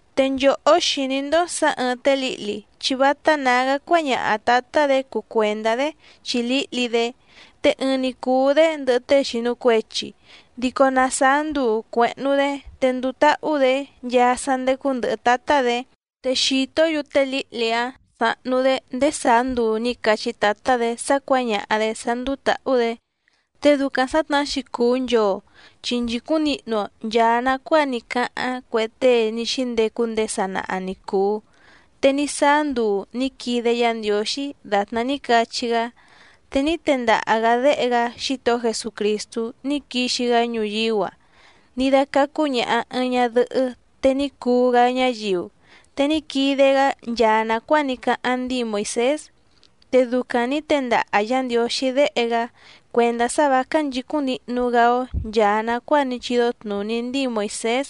Te nchòhó xìní‑ndó sǎ ɨ̀ɨⁿ té lǐhli chi vátá nǎgá cuáñaha tǎtá‑dě cuu cuèndá‑dé chi lǐhli‑dé, te ɨɨⁿ‑ni cùu‑dé ndɨhɨ tée xìnu cuechi, dico na sàá nduu cuèhnu‑dé, te nduu táhú‑dě nchaa sá ndécú ndɨ̀hɨ tátá‑dě. Te xìtó‑yu té lǐhli‑áⁿ sáhnú‑dě ndéé sàá nduu nǐ cachí tǎtá‑dě sá cuǎñaha‑dě sá ndúú tǎhú‑dě. Te ducaⁿ sǎtnahá‑xi cùu nchoo, chi nchìcúⁿ nihnu‑o nchàa nacuáa ní cáháⁿ cue tée ní xíndecu ndéé sanaha ni cùu. Te ní sáá nduu nǐ quide Yá Ndiǒxí dàtná ní cachí‑gá, te ní tendaha‑gǎ Déhe‑gá Xítohó Jesucrìstú ní quixi‑gá ñuyíú‑a, ní dácácú ñàha ɨɨⁿ ñadɨhɨ́ te ní cuu‑gá ñáyiu, te ní quide‑gá nchaa nàcuáa ní cáháⁿ ndíi Moìsés. Te ducaⁿ nǐ tendaha Yǎ Ndiǒxí Déhe‑gá cuèndá sá vǎ cánchìcúⁿ nihnu‑gá‑ó nchàa nacuáa ní chídó tnùní ndíi Moìsés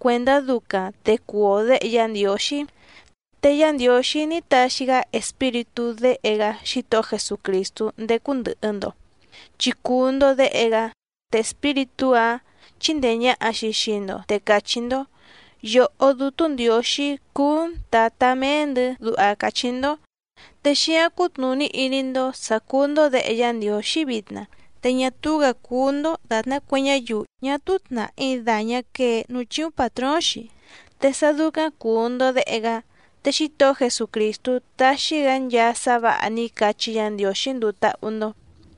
cuèndá ducaⁿ te cuu‑o děhe Yá Ndiǒxí. Te Yá Ndiǒxí ní taxi‑gá Espíritú Déhe‑gá Xítohó Jesucrìstú ndécú ndɨ̀hɨ‑ndo chi cùu‑ndo déhe‑gá, te Espíritú‑áⁿ chíndèe ñaha‑xi xii‑ndo te càchí‑ndó: “Yòhó Dútú Ndiǒxí cúú‑n Tǎtá méé‑ndɨ̌”, duha càchí‑ndó. Te xíǎⁿ cútnùní iní‑ndó sǎ cúú‑ndó děhe Yá Ndiǒxí vitna, te ñá túú‑gǎ cúú‑ndó dàtná cue ñáyiu ñá túú tnàhí dàñá quee núú chíúⁿ pàtróóⁿ‑xi. Te sá dúcáⁿ cùu‑ndo déhe‑gá, te Xítohó Jesucrìstú taxi‑gá nchaa sá vǎha ní cachí Yǎ Ndiǒxí nduu táhú‑ndó.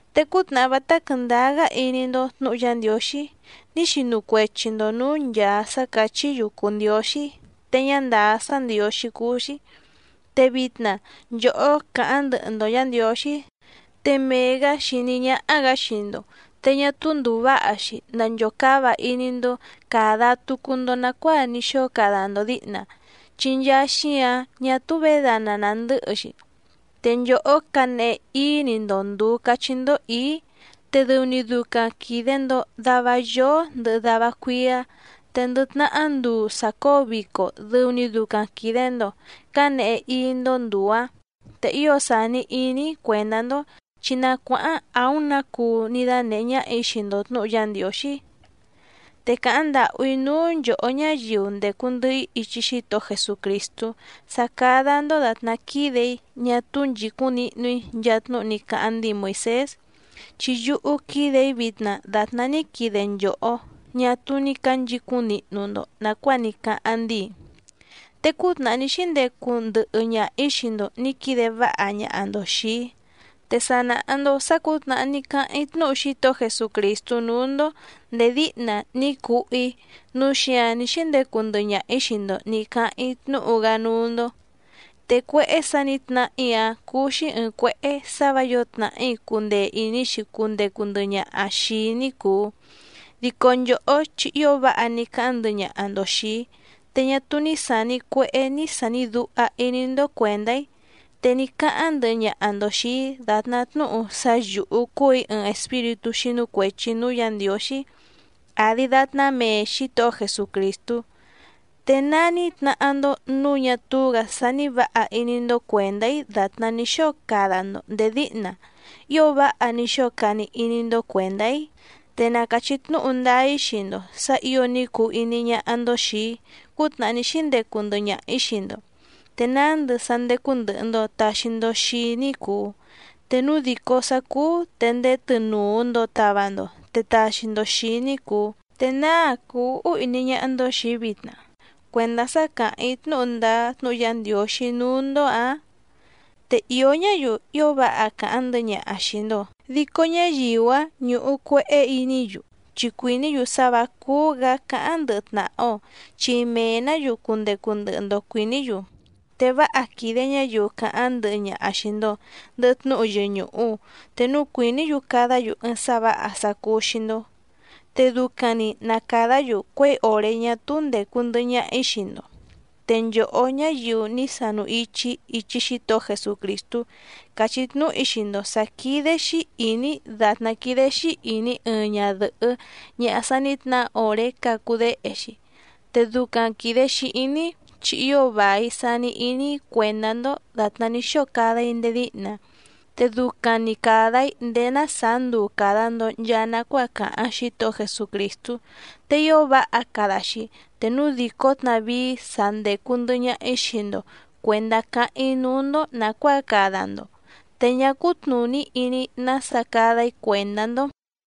Te cútnàhá vátá quɨ̀ndáá‑gá iní‑ndó tnǔhu Yá Ndiǒxí ní xinu cuechi‑ndo nǔú nchàa sá càchí‑yu cùu ndióxí te ñá ndàá sá ndiǒxí cúú‑xí. Te vitna nchòhó càháⁿ ndɨhɨ‑ndo Yǎ Ndiǒxí, te mee‑gǎ xìní ñáhá‑gǎ xii‑ndo, te ñá túú ndùu váha‑xi nanchòcáva iní‑ndó càda tucu‑ndo nacuáa ní xóo cada‑ndo dǐhna, chi nchaa xíǎⁿ ñá túú vědana nàndɨ́hɨ‑xi. Te nchòhó cǎnehe íí‑ni‑ndo ndùu cachí‑ndó ǐí, te dɨu‑ni ducaⁿ quìde‑ndo dava yoó ndɨhɨ dava cuíá, te ndɨ tnahá nduu sàcóo vico dɨu‑ni ducaⁿ quìde‑ndo cánehe íí‑ndó ndùu‑áⁿ. Te ío sàni iní‑í cuèndá‑ndó, chi na cuáháⁿ àúⁿ nǎ cuu ní dánèhé ñáhà‑í xii‑ndo tnǔhu Yá Ndiǒxí. Te càháⁿ ndàhú‑í núú nchòhó ñáyiu ndècu ndɨhɨ‑í ichi Xítohó Jesucrìstú sá cádá‑ndó dàtná quídè‑í ñá túú nchìcúⁿ nihnu‑í nchaa tnúhu ní cáháⁿ ndíi Moìsés, chi yúhú quídè‑í vitna dàtná ní quide nchòhó ñá túú ní cǎnchicúⁿ nihnu‑ndo nàcuáa ní cáháⁿ ndíi. Te cútnàhá ní xíndecu ndɨhɨ ñaha‑ǐ xii‑ndo nǐ quide váha ñaha‑ndo xìi‑í. Te sa nàha‑ndo sá cǔtnàhá ní cáháⁿ‑í tnúhu Xítohó Jesucrìstú núú‑ndó ndèé díhna ní cuhú‑í, núu xíǎⁿ ní xíndecu ndɨhɨ ñaha‑ǐ xii‑ndo nǐ cáháⁿ‑í tnúhu‑gá núú‑ndó. Te cuéhé sǎ nǐ tnahá‑í‑áⁿ cúú‑xí ɨ̀ɨⁿ cuéhé sǎ vǎ yǒo tnàhí cundee ìní‑xi cundecu ndɨhɨ ñaha xìi‑í ní cùu, dico nchòhó chi ío váha ní cáháⁿ ndɨhɨ ñaha‑ndo xìi‑í, te ñá túú ní sàni cuehé ní sàni duha iní‑ndó cuèndá‑í, te ní cáháⁿ ndɨhɨ ñaha‑ndo xìi‑í dàtná tnúhu sá yǔhú cúù‑í ɨɨⁿ espíritú xínú cuèchi núú Yǎ Ndiǒxí àdi datná méé Xǐtohó Jesucrìstú. ¿Te ná ní tnahá‑ndó nǔu ñá túú‑gǎ sání vǎha iní‑ndó cuèndá‑í dàtná ní xóo cada‑ndo ndèé díhna ío váha ní xóo cani iní‑ndó cuèndá‑í? Te na càchí tnúhu ndáá‑í xii‑ndo sǎ ǐo ní cuu iní ñáhá‑ndó xìi‑í cútnàhá ní xíndecu ndɨhɨ ñaha‑ǐ xii‑ndo, te nándɨ sá ndécú ndɨ̀hɨ‑ndo taxi‑ndo xii‑í ní cùu, te núu dìcó sá cúú te ndéé tɨnùu‑ndo tava‑ndo te taxi‑ndo xìi‑í ní cùu. ¿Te náa cùu úhú iní ñáhá‑ndó xìi‑í vitna cuèndá sá càháⁿ‑í tnúhu ndáá tnúhu Yá Ndiǒxí núú‑ndó‑ǎⁿ? Te ìó ñáyiu ío váha càháⁿ ndɨhɨ ñaha xìi‑ndo, dico ñáyiu‑áⁿ ñúhú cuèhé iní‑yu, chi cuìní‑yu sá vǎ cúú‑gǎ cáháⁿ ndɨhɨ tnàha‑o, chi mee‑nǎ‑yu cundecu ndɨhɨ‑ndo cuìní‑yu. Te váha quìde ñáyiu càháⁿ ndɨhɨ ñaha xìi‑ndo ndɨhɨ tnúhu yɨñùhu, te núu cuìní‑yu cadá‑yu ɨɨⁿ sá vǎha sá cúú‑xí‑ndó. Te ducaⁿ‑ni na càdá‑yu cuěi òré ñá túú ndècu ndɨhɨ ñaha‑í xii‑ndo. Te nchòhó ñáyiu ní sanu ichi‑í ichi Xítohó Jesucrìstú càchí tnúhu‑í xii‑ndo sǎ quídé‑xí ìní‑í dàtná quídé‑xí ìní ɨɨⁿ ñadɨ̀hɨ́ ñaha sa ní tnahá òré cacu déhe‑xi, te ducaⁿ quìde‑xi iní‑í, chi ío vài sani iní‑í cuèndá‑ndó dàtná ní xóo cada‑í ndéé díhna, te ducaⁿ‑ni càda‑í ndéé ná sàá nduu càda‑ndo nchaa nacuáa càháⁿ Xítohó Jesucrìstú. ¡Te ío váha cada‑xi te núu dìcó tnavíí sa ndècu ndɨhɨ ñaha‑í xii‑ndo cuèndá cáháⁿ‑í núú‑ndó nàcuáa cada‑ndo, te ñá cútnùní iní‑í nása cada‑í cuèndá‑ndó!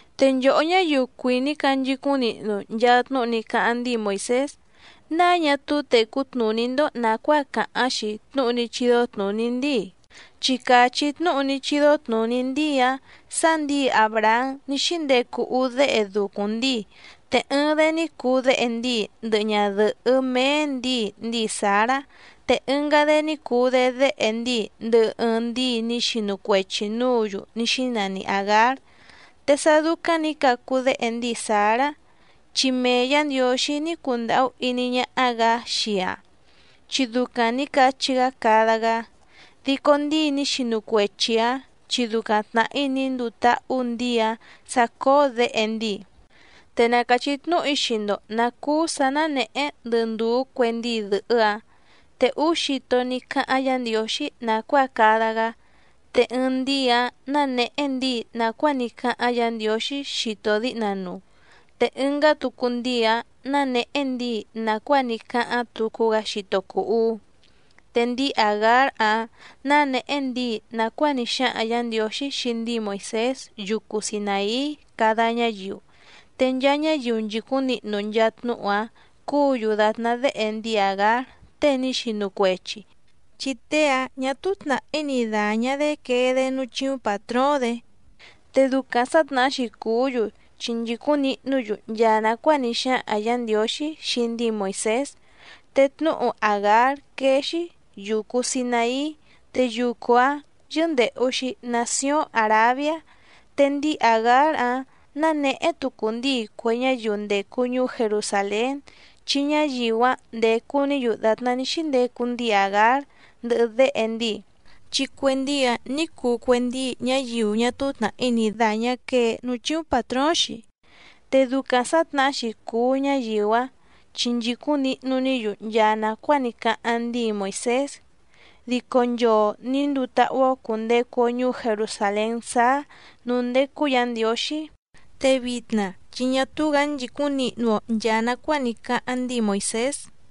Te nchòhó ñáyiu cuìní canchicúⁿ nihnu nchaa tnúhu ní cáháⁿ ndíi Moìsés, ¿náa ñá túú tècú tnùní‑ndó nàcuáa càháⁿ‑xi tnúhu ní chídó tnùní ndíi? Chi càchí tnúhu ní chídó tnùní ndíi‑áⁿ sǎ ndǐi Àbrahám ní xíndecu úú déhe ducuⁿ ndíi, te ɨɨⁿ‑dé ní cuu déhe ndíi ndɨhɨ ñadɨ̀hɨ́ méé ndǐi ndíi Sǎrá, te ɨngá‑dé ní cuu‑dé déhe ndíi ndɨhɨ ɨɨⁿ ndíi ní xinu cuechi nǔǔ‑yu ní xínani Àgár. Te sá dúcáⁿ nǐ cacu déhe ndíi Sǎrá, chi mee Yǎ Ndiǒxí ní cundàhú iní ñáhá‑gǎ xii‑aⁿ, chi ducaⁿ nǐ cachí‑gá cada‑gá. Dico ndíi ní xinu cuechi‑ǎⁿ chi ducaⁿ tnàhí ní nduu táhú ndǐi‑áⁿ sǎ cóó děhe ndíi. Te na càchí tnúhu‑í xii‑ndo nǎ cúú sǎ nánèhé ndɨ ndùú cue ndíi dɨ̀hɨ́‑áⁿ. Te úú xito ní cáháⁿ Yǎ Ndiǒxí nàcuáa cada‑gá, te ɨɨⁿ ndíi‑áⁿ nánèhé ndíi nàcuáa ní cáháⁿ Yǎ Ndiǒxí xito díhna nuu, te ɨngá tucu ndíi‑áⁿ nánèhé ndíi nàcuáa ní cáháⁿ tucu‑gá xito cùu uú. Te ndíi Àgár‑áⁿ nánèhé ndíi nàcuáa ní xáhaⁿ Yǎ Ndiǒxí xii ndíi Moìsés yucu Sinàí cada ñáyiu, te nchaa ñáyiu nchìcúⁿ nihnu nchaa tnúhu‑áⁿ cúǔ‑yu dàtná déhe ndíi Àgár tée ní xinu cuechi, chi tée‑áⁿ ñà túú tnàhí ni dàñá‑dé quee‑dé núú chíúⁿ pàtróóⁿ‑dě, te ducaⁿ sǎtnahá‑xi cùú‑yu chi nchìcúⁿ nihnú‑yu nchaa nàcuáa ní xáhaⁿ Yǎ Ndiǒxí xii ndíi Moìsés. Te tnúhu Àgár quéé‑xi: Yucu Sinàí, te yucu‑áⁿ yɨ́ndèhu‑xi nacióⁿ Àrabiá. Te ndíi Àgár‑áⁿ nánèhé tucu ndíi cue ñáyiu ndècu ñuú Jerusàlén, chi ñáyiu‑áⁿ ndécú‑nǐ‑yu dàtná ní xíndecu ndíi Àgár ndɨhɨ déhe ndíi, chi cue ndíi‑áⁿ nǐ cuu cue ndíi ñáyiu ñá túú tnàhí ni dàñá quee núú chíúⁿ pàtróóⁿ‑xi, te ducaⁿ sǎtnahá‑xi cùu ñáyiu‑áⁿ chi nchìcúⁿ nihnu‑ní‑yu nchaa nàcuáa ní cáháⁿ ndíi Moìsés. Dico nchoo nǐ nduu táhú‑ó cùndecu‑o ñuú Jerusàlén sáá nǔú ndécú Yǎ Ndiǒxí, te vitna chi ñá túú‑gǎ nchìcúⁿ nihnu‑o nchàa nacuáa ní cáháⁿ ndíi Moìsés.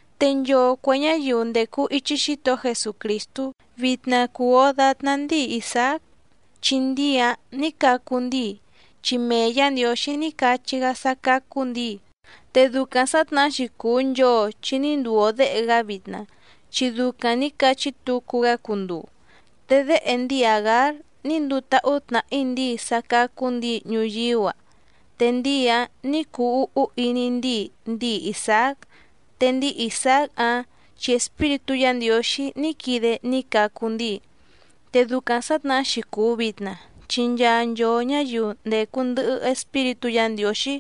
Te nchoo cuè ñáyiu ndècu ichi Xítohó Jesucrìstú vitna cùu‑o datná ndíi Isàác, chi ndíi‑áⁿ nǐ cacu ndíi, chi mee Yǎ Ndiǒxí ní cachí‑gá sá cácú ndǐi. Te ducaⁿ sǎtnahá‑xi cùu nchoo chi ní nduu‑o děhe‑gá vitna chi ducaⁿ nǐ cachí tucu‑gá cunduu. Te déhe ndíi Àgár ní nduu táhú tnàhí ndíi sá cácú ndǐi ñuyíú‑a, te ndíi‑áⁿ nǐ cuu úhú iní ndíi ndíi Isàác, te ndíi Isàác‑áⁿ chi Espíritú Yǎ Ndiǒxí ní quide ní cacu ndíi. Te ducaⁿ sǎtnahá‑xi cùu vitna, chi nchaa nchoo ñǎyiu ndècu ndɨhɨ Espíritú Yǎ Ndiǒxí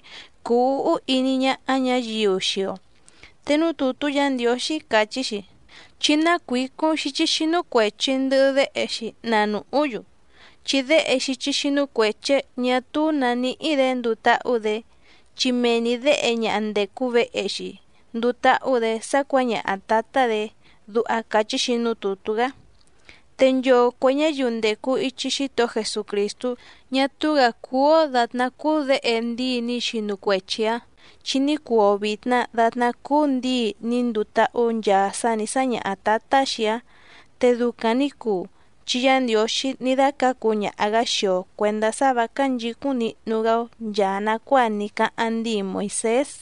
cúú ǔhú iní ñáhá ñǎyiu xii‑o. Te núú tùtú Yǎ Ndiǒxí càchí‑xi: “Chí nácuǐcúⁿ xíchí xínú cuèchi ndɨhɨ déhe‑xi na nùhú‑yu, chi déhe xíchí xínú cuèchi‑áⁿ ñà túú nǎ níhí‑dě nduu táhú‑dě, chi mee‑ni děhe ñaha ndècu vehe‑xi nduu táhú‑dě sá cuǎñaha tǎtá‑dě”, duha càchí‑xi núú tùtú‑gá. Te nchoo cuè ñáyiu ndècu ichi Xítohó Jesucrìstú ñá túú‑gǎ cúú‑ó dàtná cúú děhe ndíi ní xinu cuechi‑ǎⁿ, chi ní cuu‑o vìtna datná cúú ndǐi ní nduu táhú nchaa sá nǐ sáñaha tǎtá‑xi‑áⁿ. Te ducaⁿ nǐ cuu, chi Yá Ndiǒxí ní dácǎcu ñaha‑gǎ xii‑o cuèndá sá vǎ cánchìcúⁿ nihnu‑gá‑ó nchàa nacuáa ní cáháⁿ ndíi Moìsés.